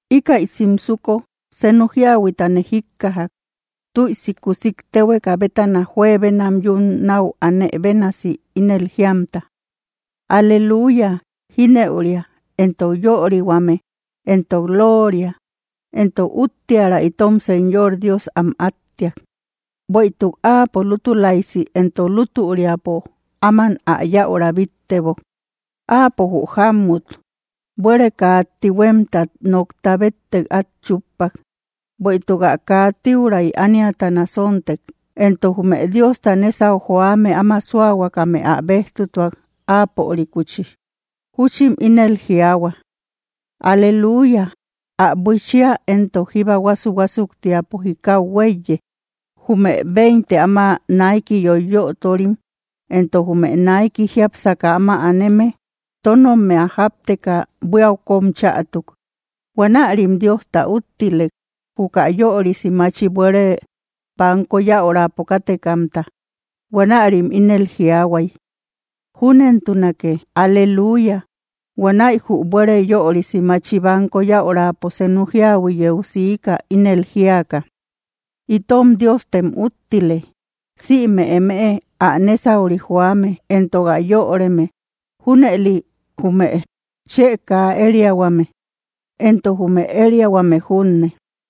Íkäi simsuko senu jíahuitane jíkkajak, tüisi kuusik téhueka bétana, juebenam yun náu anë bénasi, ínel jíamta: ¡Aleluya! Jínëuria, entok yörihuame, entok lóoria, entok úttiära, itom Señor Dios am áttiak. Bueïtuk áapo lútulaisi entok lútüriapo áman ä yäura bíttebok. Áapo jü jámut buére kaa tihuemtat nokta béttek át chúppak, bueïtuk ä kaa tiuray ániata nasontek. Entok jume Diosta nésau joame áma súahuakame ä bejtutuak apörikuchi. Juchim ínel jiaahua: —¡Aleluya! Ä buichia éntok jíba huásu‑huásuktiapo jikau huéiye. Jume veinte áma naiki yoiyöturim entok jume naiki jiápsaka áma aneme tónommia jápteka buíau kóm chätuk. Huanärim Diosta úttilek, juka yörisi machi buére banko yäurapo kátekamta. Huanärim ínel jiaahuay: —¡Júnentunake! ¡Aleluya! Huanäi jü buére yörisi machi banko yäurapo senu jíahui yeu siika, ínel jíaka: Itom Diostem úttile, sïme eme ä nésauri joame, entok ä yöreme, junëli jume chë kaa ériahuame entok jume ériahuame junne.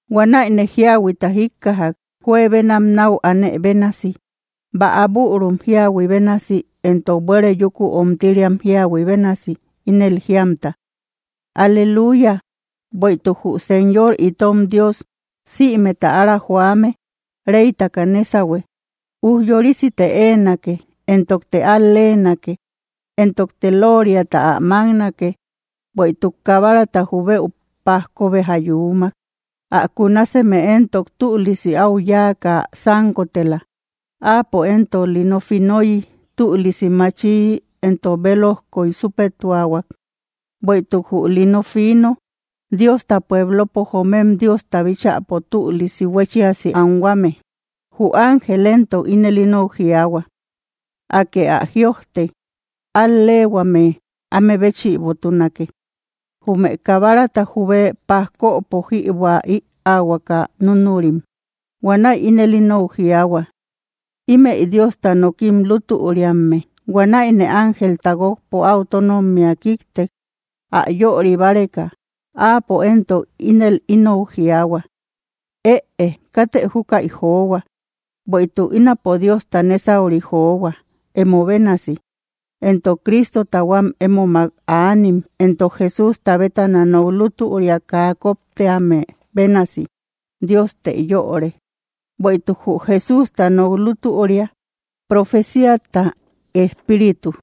Huanäine jíahuita jíkkajak, juebenam náu anë bénasi, bäa bürum jíahui bénasi éntok buére yúku omtiriam jíahui bénasi, ínel jíamta: ¡Aleluya! Bueïtuk jü Señor itom Dios sïmeta ára joame reytaka nésahue. Ujyorisite éenake, entokte al-leenake, entokte lóoriata ä máknake, bueïtuk Kabarata jubëu pajko béja yuumak. Ä kunaseme éntok tülisi áu yáaka sánkotela. Áapo éntok lino finoyi tülisi machiyi entok belojkoy súpetuahuak. Bueïtuk jü lino fiino, Diosta pueblopo joomem Diosta bíchäpo tülisi huéchiasi anhuame. Jü ángel éntok ínel inou jiaahua: —Akë ä jïojte: “Al‑leehuame áme béchïbotunake, jume Kabarata jubë pajkopo jïbuä ïaahuaka núnurim.” Huanäi ínel inou jiaahua: —Ímëi Diosta nokim lútüriamme. Huanäine ángelta guókpo áu tónommia kíktek, ä yöri báreka. Áapo éntok ínel inou jiaahua: —Ëe, ¡katë júkäi johua! Bueïtuk ínapo Diosta nésauri johua, emo bénasi, entok Cristota huám émomak aanim, entok Jesústa bétana nok lútüria kaa koptíame bénasi. Diostë yöre. Bueïtuk jü Jesústa nok lútüria profecíata espíritu.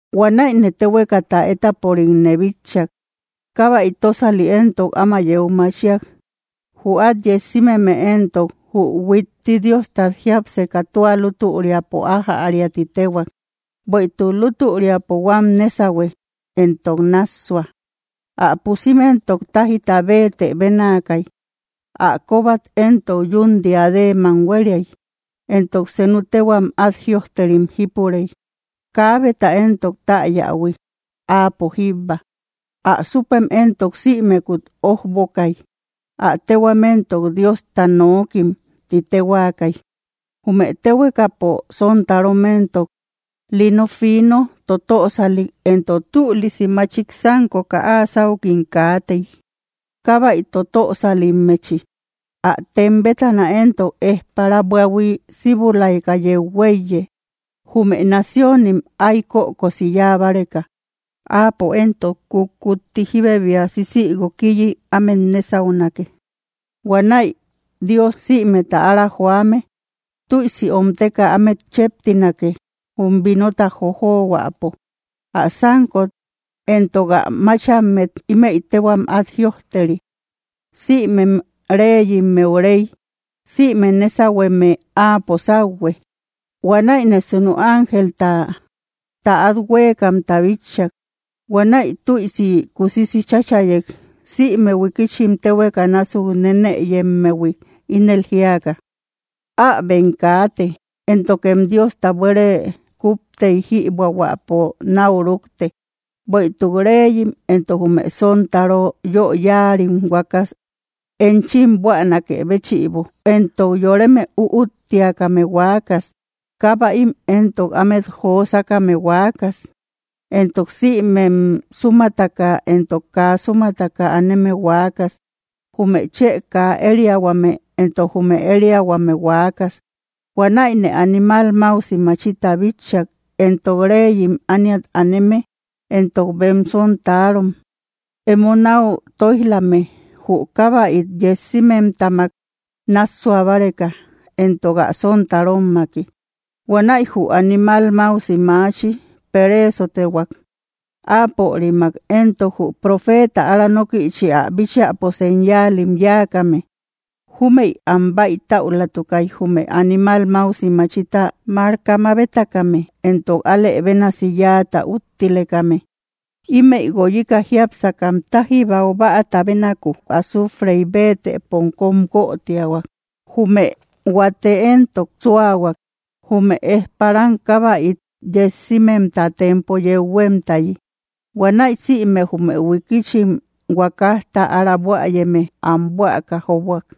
Huanäine téhuekata étaporikne bitchak; kábäi tósali éntok áma yeu machiak. Jü át yessimeme éntok, jü huitti Diostat jiápseka tua lútüriapo ájäria ti téhuak, bueïtuk lútüriapo huám nésahue, entok nássua. Ä pusim éntok tájíta béetë bénaakay. Ä kóbat éntok yún diadeemam huériay. Entok senu téhuam át jïojterim jípurey, kaabeta éntok täyähui, áapo jíbba. Ä súpem éntok sïmekut ójbokay; ä téhuam éntok, “Diosta Nookim”, tim téhuaakay. Jume téhuekapo sontarom éntok, lino fino totösalik entok tülisi machik sánkoka áa sáukim kaatey, kábäi totösalimmechi. Ä tem bétana éntok ejpara buahui síbulaika yeu huéiye, jume naciónim, ay kökosi yáa báreka. Áapo éntok kutkutti jíbebia sisïguokiyi ámet nésaunake. Huanäi Dios sïmeta ára joame tüisi omteka ámet cheptinake, jum vinota jojohuäpo. Ä sánkot entok ä máchammet ímëi téhuam át jïojteri: “Sïmem reyimmeu Rey sïme nésahueme áapo sauhue.” Huanäine senu ángelta täat huékamta bitchak. Huanäi tüisi kusisi cháchayek, sïme huikichim téhueka násuk nenëyemmehui, ínel jíaka: —¡Äbem kaate, éntokem Diosta buére kuptey jïbuähuäpo náu rúkte, bueïtuk reyim entok jume sontaro yö yáarim huaakas enchim buänakë béchïbo, entok yoreme üúttiakame huaakas, kábäim entok ámet josakame huaakas, entok sïmem súmataka entok kaa súmataka aneme huaakas, jume chë kaa ériahuame entok jume ériahuame huaakas! Huanäine animal máusi machita bitchak, entok reyim ániat aneme entok bem sontarom, emo náu tóij‑lame jü kábäit yessimemtamak nássua báreka, entok ä sontarommaki. Huanäi jü animal máusi machi pereesotehuak, áapörimak éntok jü profeeta ára nókïchi ä bíchäpo señaalim yáakame. Júmëi am bäitäulatukay, jume animal máusi machita marka mabetakame entok alë bénasi yáata úttilekame. Ímëi guoyika jiápsakam táji baubäata bénaku azuufrey béetëpom kóm guötiahuak. Jume huate éntok súahuak, jume ejparam kábäit yessimemta tempo yeu huémtayi. Huanäi sïme jume huikichim huakajta ára buäyeme am buäka jóbuak.